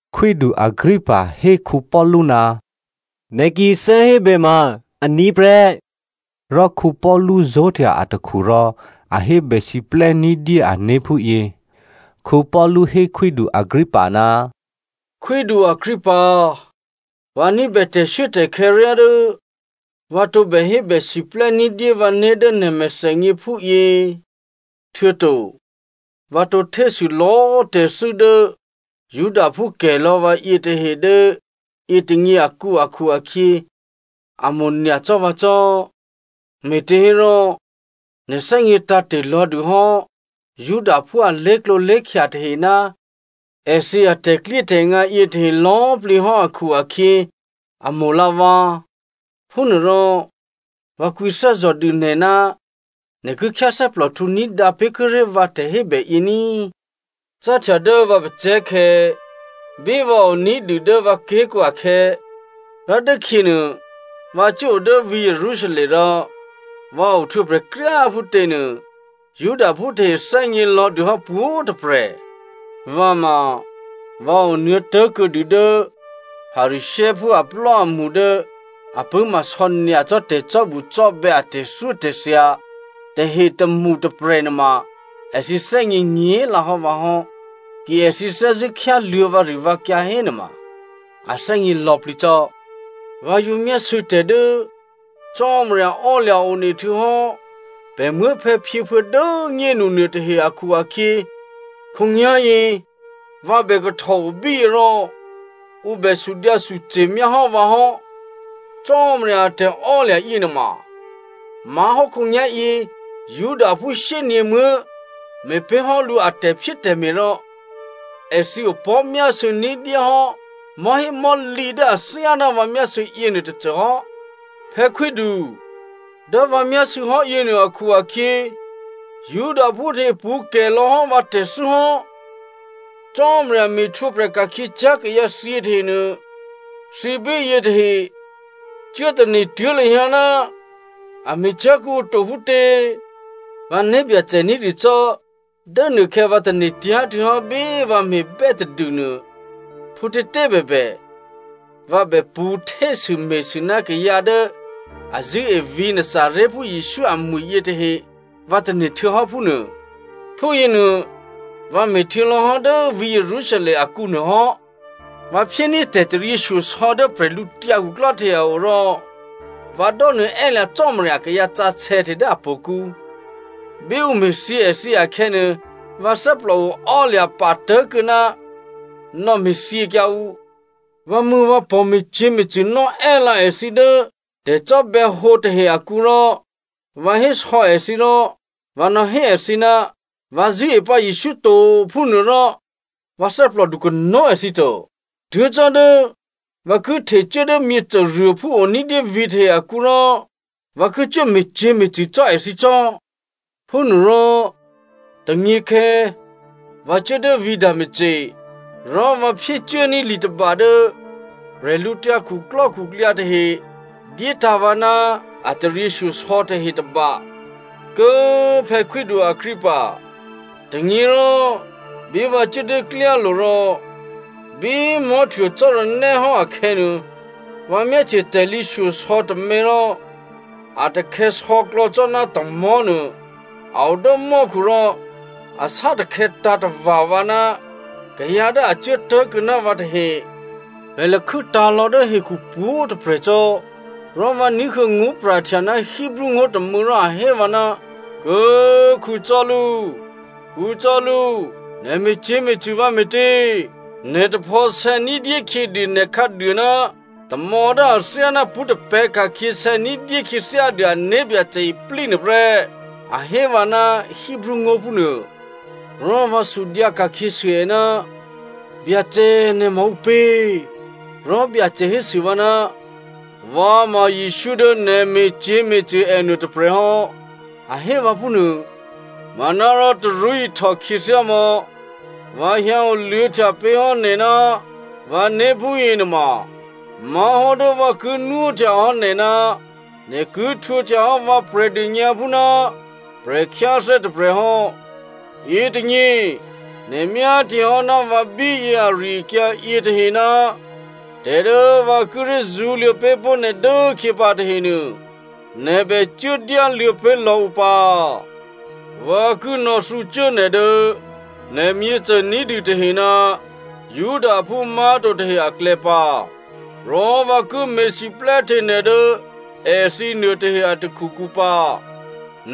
Khwídu Agrippa hé Paulu, “Nè̤ ki thè́hébè ma aní̤ prè́.” Rò Paulu zó̤htya atakhu rò a hébèsiplè́ ní̤dyé ané̤ phúyě: Paulu hé khwídu Agrippa, “Khwídu Agrippa꤮, vǎ ní̤bè tè̤shuốtè̤khè̌ ryá dố vǎ tǒbè hébèsiplè́ ní̤dyé vǎné̤ dố nè̤ mèthènyě phúyě, htuô̌to vǎ tǒ htésû lò̌꤮ tè̤thû́ dố Judaphú kè̤lò̌ vǎ yětahe dố yětônyě akǔ akhu-akhyě, a mo̤nyacò́ vǎ cò́. Me̤těhérò nè̤ thè́gně tǎ̤te̤ lò̌dûhò́ Judaphú a lé̤klǒlé̤khya tahe ná èthǐ atè̤klyétè̤ngǎ yětahe lò̌꤮ plǐ hò́ akhu-akhyě a mo̤lǎ vǎ. Phúnuôrò, vǎ kwǐthè́zò̤ dû nè̤ ná nè̤ ki khyáthè́plòhtǔ ní̤dǎ pé̤kuô̌ré̤ vǎ tè̤hébèyě ní꤮. “Cáhtya dố vǎ pacè̤̌khè̌, bí vǎ o ní̤dû dố vǎ ké̤kǔ akhè̌, rò dốkhyěnuô vǎ cuốo dố vǐ̤ Jerusalem rò vǎ ohtwǒprè̤ kryá꤮ phútěnuô, Judaphú tahe thè́gnělò̌ dûhò́ pwǒ̤꤮ tôprè̤. Vǎ ma vǎ onuô̌tố̤kuô̌dû dố Pharisěophú aplò́amṳ dố a pṳ̂́ma sò̌nyacò́ tè̤cò́bucò́bè̌ a tè̤thyótè̤thya tahe tômṳ tôprè̤nuôma èthǐ thè́gně nyě̤lǎhò́ vǎ hò́. Ki èthǐ thè́zṳ̂́ khyáluô̌ vǎrivǎkyǎ hénuôma a thè́gně lò̌plǐ cò́. Vǎ yǒ myásû̌ tè̤ dố Cò́marya ò́lya̤ one htuô̌hò́ pè̤ muố̤phè̌phyěphuô̌ dố꤮ nyénu nuôtahe akhu-akhyě, khǒnyá̤yě vǎ bè kahtòo bíyě rò ǔ bè sudyǎsuce̤ myáhò́ vǎ hò́. Cò́marya a tè̤ò́lya̤ yěnuôma má̤hò́ khǒnyá̤yě Judaphú shyényě̤muố̤ me̤ pé̤hò́ lǔ a tè̤phyétè̤me̤, rò èthǐ opò̤́myásû̌ ní̤dyéhò́ mò̤́hémò̤́lǐ dố athyáná vǎ myásû̌ yěnuô tôcôhò́. Phè̌khwídu꤮ dố vǎ myásû̌hò́ yěnuô akhu-akhyě, Judaphú tahe pṳ̌ kè̤ lò̌hò́ vǎ tè̤thû́ hò́. Cò́marya me̤htwǒprè̤ ka̤khyěcyá̤ kayǎthyě tahenuô, thǐ bíyě tahe cuốtane̤ tuố̤ lahyǎ ná a me̤cyá̤ kuô̌ǔ to phútě? “Vǎ né̤byacè ní̤dû cò́, dố nuôkhè̌ vǎ tane̤tyá̤ htuô̌hò́ bí vǎ me̤bè́ tadûnuô, phútětě꤮ bèbè vǎ bè pṳ̌ htésûme̤sû ná kayǎ dố a zṳ̂́e vǐ̤ Nazarèphú Jesǔ amwi̤ yěnuôtahe, vǎ tane̤ htuô̌hò́ phúnuô. Phúyěnuô vǎ me̤htuô̌lò̌hò́ dố vǐ̤ Jerusalem akǔ nuôhò́. Vǎ phyéní̤ tè̤taryěshyosò̌ dố prè̤lǔtyǎ khuklò́ tahe a o rò vǎ dò́nuô̌ è́lǎ Cò́marya akayǎ sǎsè̌ tahe dố htò̌kǔ. Bí ǔ me̤thyě èthǐ akhè̌nuô, vǎ thè́plòo ò́lya̤ patố̤kuô̌ ná nò̌me̤thyěkyǎ ǔ. Vǎmṳ̂̌vǎpò̤, me̤cyě̤me̤cṳ̂ nò́ è́lǎ èthǐ dố tè̤cò́bè̌hǒ tahe akǔ, rò vǎ hésò̌ èthǐ rò vǎ nò̌hé èthǐ, ‘Vǎ zṳ̂́e pǎ Jesǔ to’ phúnuô, rò vǎ thè́plòdu kanó̤꤮ èthǐ to. Tuố̤ cò́ dố vǎ ki htecuố dố myěcôruôphú o ní̤dyé vǐ̤tahe akǔ rò, vǎ ki cuố me̤cyě̤me̤cṳ̂ cò́ èthǐ cò́.” “Phúnuôrò tônyěkhè̌, vǎ cuố dố vǐ̤ Damasco. Rò vǎ phyécuốní̤ li tôba dố bwídukhu tahe dyétǎ̤ vǎ ná a taryěshyosò̌ tahe tôba. Kố꤮ phè̌ khwídu Agrippa, tônyěrò bí vǎ cuố dố klyálo̤ rò bí꤮ mò̤́htuô cò́ranè́ hò́ akhè̌nuô, vǎ myáhtye tè̤lǐ shyosò̌ tômě rò a takhè̌sò̌klò̌ cò́ ná tamò̤́nuô, a o dố mò́khu rò a sátakhè̌tǎ̤ tava̤ vǎ ná kayǎ dố a cuố tố̤kuô̌ ná vǎ tahe. Pè̤ lakhû́tǎ̤ lò̌ dố hekhu pwǒ̤꤮ tôprè̤ cò́, rò vǎ ní̤huô̌ ngó̤pra̤htya ná Hebreo ngó̤ tômû̌ rò a hé vǎ, ‘Kố꤮ Saulu꤮, Saulu꤮, nè̤ me̤cyě̤me̤cṳ̂ vǎ me̤tě? Nè̤ taphò̌sè̌ ní̤dyé khyědû nè̤ khǎduô ná tamò̌ dố athyáná pṳ́ tapè̤̌ ka̤khyě sè̌ ní̤dyé khyěthyádû a né̤byacè iplí nuôprè́,’ a hé vǎ ná Hebreo ngó̤ phúnuô. “Rò vǎ sudyǎ ka̤khyěsû è, ‘Byacè꤮, nè̤ ma ǔpě?’ “Rò Byacè hésû vǎ, ‘Vǎ ma Jesǔ dố nè̤ me̤cyě̤me̤cṳ̂ ènuô tôprè̤hò́,’ a hé vǎ phúnuô. ‘Manárò tarú ihtò khyěthyámò̌, vǎ hyǎ oluô̌htya pé̤hò́ nè̤ ná vǎné̤ phúyě nuôma má̤hò́ dố vǎ ki nwóhtyahò́ nè̤ ná nè̤ ki htwǒhtyahò́ vǎ Prè̤dônyǎphú ná prè̤khyáthè́ tôprè̤ hò́. Yětônyě nè̤ myáhtyehò́ ná vǎ bíyě ari-akyǎ yětahe ná tè̤ dố vǎ kíré̤ zṳ̌luô̌ pé̤pó̤ nè̤ dốkhyě pǎ tahenuô, nè̤ bè cuốdyáluô̌ pé̤lò̌ ǔ pǎ꤮. Vǎ ki nò̌thǔcuố nè̤ dố nè̤ myěcôní̤dû tahe ná Judaphú má̤to tahe aklè̌ pǎ. Rò vǎ ki me̤siplè́hte nè̤ dố èthǐ nuôtahe a takhukǔ pǎ.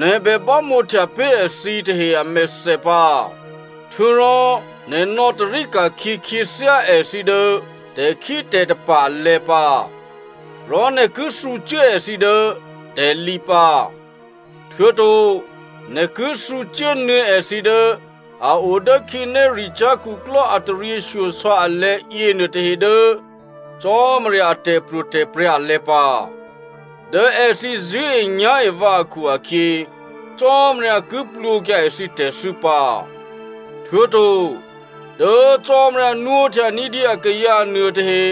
Nè̤ bè bámǒhtya pé̤ èthǐ tahe amèthè pǎ, htuô̌rò nè̤ nò̌tarí ka̤khyě khyěthyá èthǐ dố tè̤khítè̤tapa̤ alè̤̌ pǎ, rò nè̤ ki thǔcuố èthǐ dố tè̤lǐ pǎ, htuô̌to nè̤ ki thǔcuốnuô̌ èthǐ dố a o dố khǐnéricyá̤ khuklò́ a taryěshyosò̌ alè̤̌ yěnuôtahe dố Cò́marya a tè̤pro̤tè̤prya̤ alè̤̌ pǎ. Dố èthǐ zṳ̂́enyá̤e vǎ akhu-akhyě, Cò́marya ki plwǒkyǎ èthǐ tè̤thû́ pǎ, htuô̌to dố Cò́marya nwóhtya ní̤dyé akayǎ nuôtahe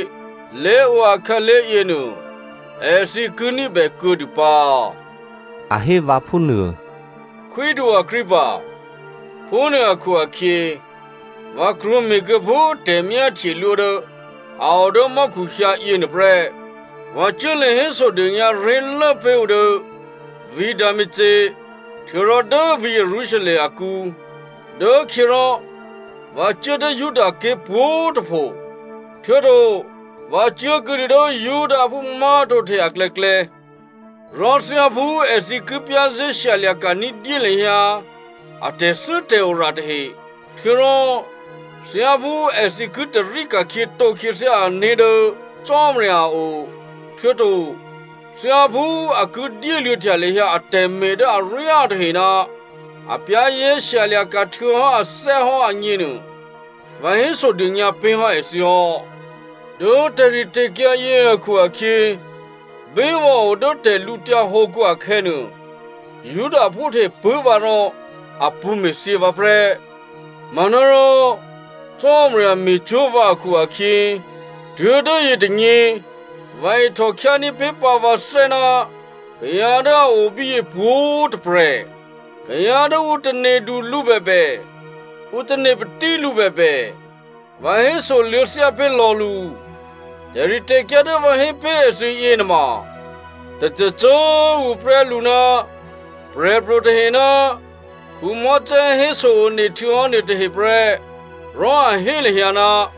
lé̤o akhǎlé̤ yěnuô, èthǐ ki ní̤bè kuô̌dû pǎ,’” a hé vǎ phúnuô. “Khwídu Agrippa꤮ phúnuô akhu-akhyě, vǎ krwǒme̤kuô̌ phú tè̤myáhtyelwó dố a o dố mò́khu hyǎ yěnuôprè́. Vǎ cuốlě hésodônyǎ ré̤lố pé̤ ǔ dố vǐ̤ Damasco htuô̌rò dố vǐ̤ Jerusalem akǔ, dốkhyěrò vǎ cuố dố Judaké̤ pwǒ̤꤮ tôpho, htuô̌to vǎ cuố kuô̌dû dố Judaphú má̤to tahe aklè̌klè̌. Rò thyáphú èthǐ ki za̤ ní̤dû lahyǎ a tè̤thû́tè̤ora tahe, htuô̌rò thyáphú èthǐ ki tarí ka̤khyětǒ khyěthyá ané̤ dố Cò́marya a o, htuô̌to thyáphú a ki dyéluô̌htya lahyǎ atè̤me̤ dố aryá tahe ná a za̤ ní̤dû htuô̌hò́ ané̤ agněnuô, vǎ hésodônyǎ pé̤hò́ èthǐ hò́. Dố tè̤ritè̤kyǎ yě akhu-akhyě, bí vǎ o dố tè̤lǔtyǎ hǒkǔ akhè̌nuô, Judaphú tahe pṳ̂́ vǎ rò a pṳ̌ me̤thyě vǎ prè́. Manárò, Cò́marya me̤cwó̤ vǎ akhu-akhyě, tuố̤dố yětônyě vǎ ihtò khyání̤ pé̤pǎ vǎthè́ ná kayǎ dố a o bíyě pwǒ̤꤮ tôprè̤. Kayǎ dố ǔ tane̤du lǔ bèbè, ǔ tane̤ patí lǔ bèbè vǎ hésoluô̌ thyápé̤ lò̌ lǔ. Tè̤ritè̤kyǎ dố vǎ hé pé̤ èthǐ yěnuôma, tôcôcô꤮ tuô̌ prè́ lǔ ná prè̤pro̤ tahe ná Mosè héso-one htuô̌hò́ nuôtahe prè́, rò a hé lahyǎ,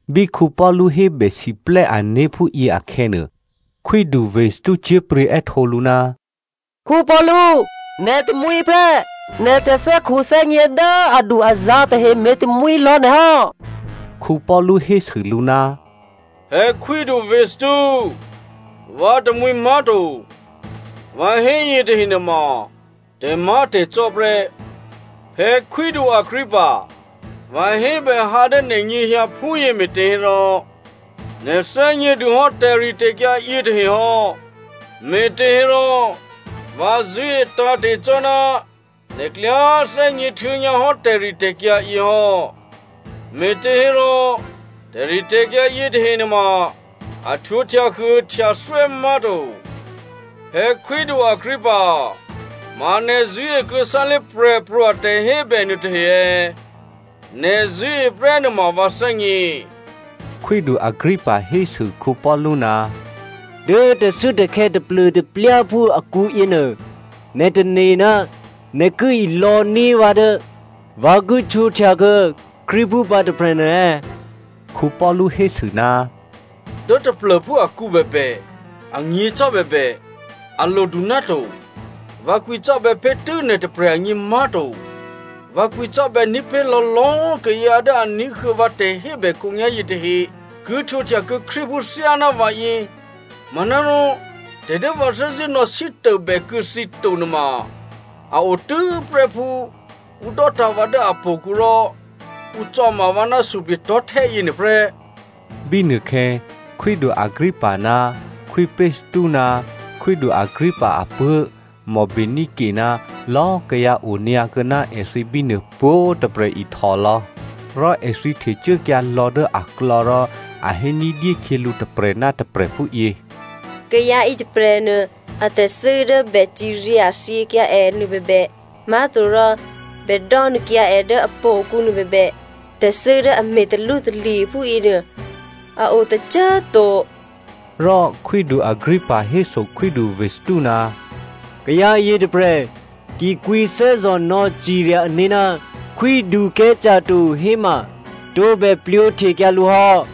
Bí Paulu hébèsiplè́ ané̤ phúyě akhè̌nuô, khwídu Festo cyé̤pryě̤ è́htǒ lǔ, “Paulu꤮, nè̤ tamwǐ prè́. Nè̤ tè̤thè́khuthè́gně dố adu-azǎ̤ tahe me̤tamwǐ lò̌ nè̤ hò́.” Paulu hésû lǔ, “Phè̌ khwídu Festo꤮, vǎ tamwǐ má̤to. Vǎ hé yětahe nuôma tè̤má̤tè̤cò́ prè́. Phè̌ khwídu Agrippa, vǎ hébè hǎ dố nè̤nyěhyǎ phúyě me̤těhérò, nè̤ thè́gnědûhò́ tè̤ritè̤kyǎ yětahe hò́. Me̤těhérò vǎ zṳ̂́e tǎ̤te̤ cò́ ná nè̤ klyá thè́gně htuô̌nyǎhò́ tè̤ritè̤kyǎ yě hò́, me̤těhérò tè̤ritè̤kyǎ yětahe nuôma a htwǒ htyahuôhtyathwè́ má̤to. Phè̌ khwídu Agrippa꤮, ma nè̤ zṳ̂́e kuô̌ sálé̤ prè̤pro̤ a tè̤hébè nuôtahe è̌? Nè̤ zṳ̂́e prè́ nuôma vǎ thè́gně.” Khwídu Agrippa hésû Paulu, “Dố tè̤shuốtè̤khè̌ taplô̤taplyáphú akǔ yěnuô, nè̤ tane̤ ná nè̤ ki ilò̌ní̤ vǎ dố vǎ ki htwǒhtyakuô̌ Krístuphú pǎ tôprè̤nuô è̌?” Paulu hésû, “Dố taplô̤phú akǔ bèbè, anyě̤ cò́ bèbè, a lodu náto. Vǎ kwǐcò́bè̌ pé̤tû́ nè̤tôprè̤ agně má̤to, vǎ kwǐcò́bè̌ ní̤pé̤lò̌ lò̌꤮ kayǎ dố a ní̤huô̌ vǎ tè̤hébè khǒnyá̤yě tahe ki htwǒhtyakuô̌ Krístuphú thyáná vǎyě, manárò tè̤ dố vǎ thè́zṳ̂́ nò̌sítôbèkuô̌ thǐ to nuôma a otû́prè́ phú ǔ dò́tǎ̤ vǎ dố htò̌kǔ rò ǔ cò̌ma vǎ ná suplye̤tò̤́htè́ yěnuôprè́.” Bínuôkhè̌ khwídu Agrippa ná khwí Festo ná khwídu Agrippa apuố̤ Bernice ná lò̌꤮ kayǎ onyǎ kuô̌ná èthǐ bínuô pwǒ̤꤮ tôprè̤ ihtòlò̌. Rò èthǐ htecuốkyǎ lò̌ dố aklò̌ rò a hé ní̤dyé khyělǔ tôprè̤ ná tôprè̤ phúyě, “Kayǎ yětôprè̤nuô atè̤thû́ dố bè cirya thyěkyǎ è nuôbèbè, má̤torò bè dò́nuô̌kyǎ è dố htò̌kǔ nuôbèbè, tè̤thû́ dố a me̤ talwótalye̤ phúyěnuô, a o tôcô꤮ to.” Rò khwídu Agrippa héso khwídu Festo, “Kayǎ yětôprè̤ ki kwǐthè́zò̤ nò̌cirya ané̤ ná Khwídu Caesare to héma, tǒbè plwǒhtekyǎ lǔ hò́.”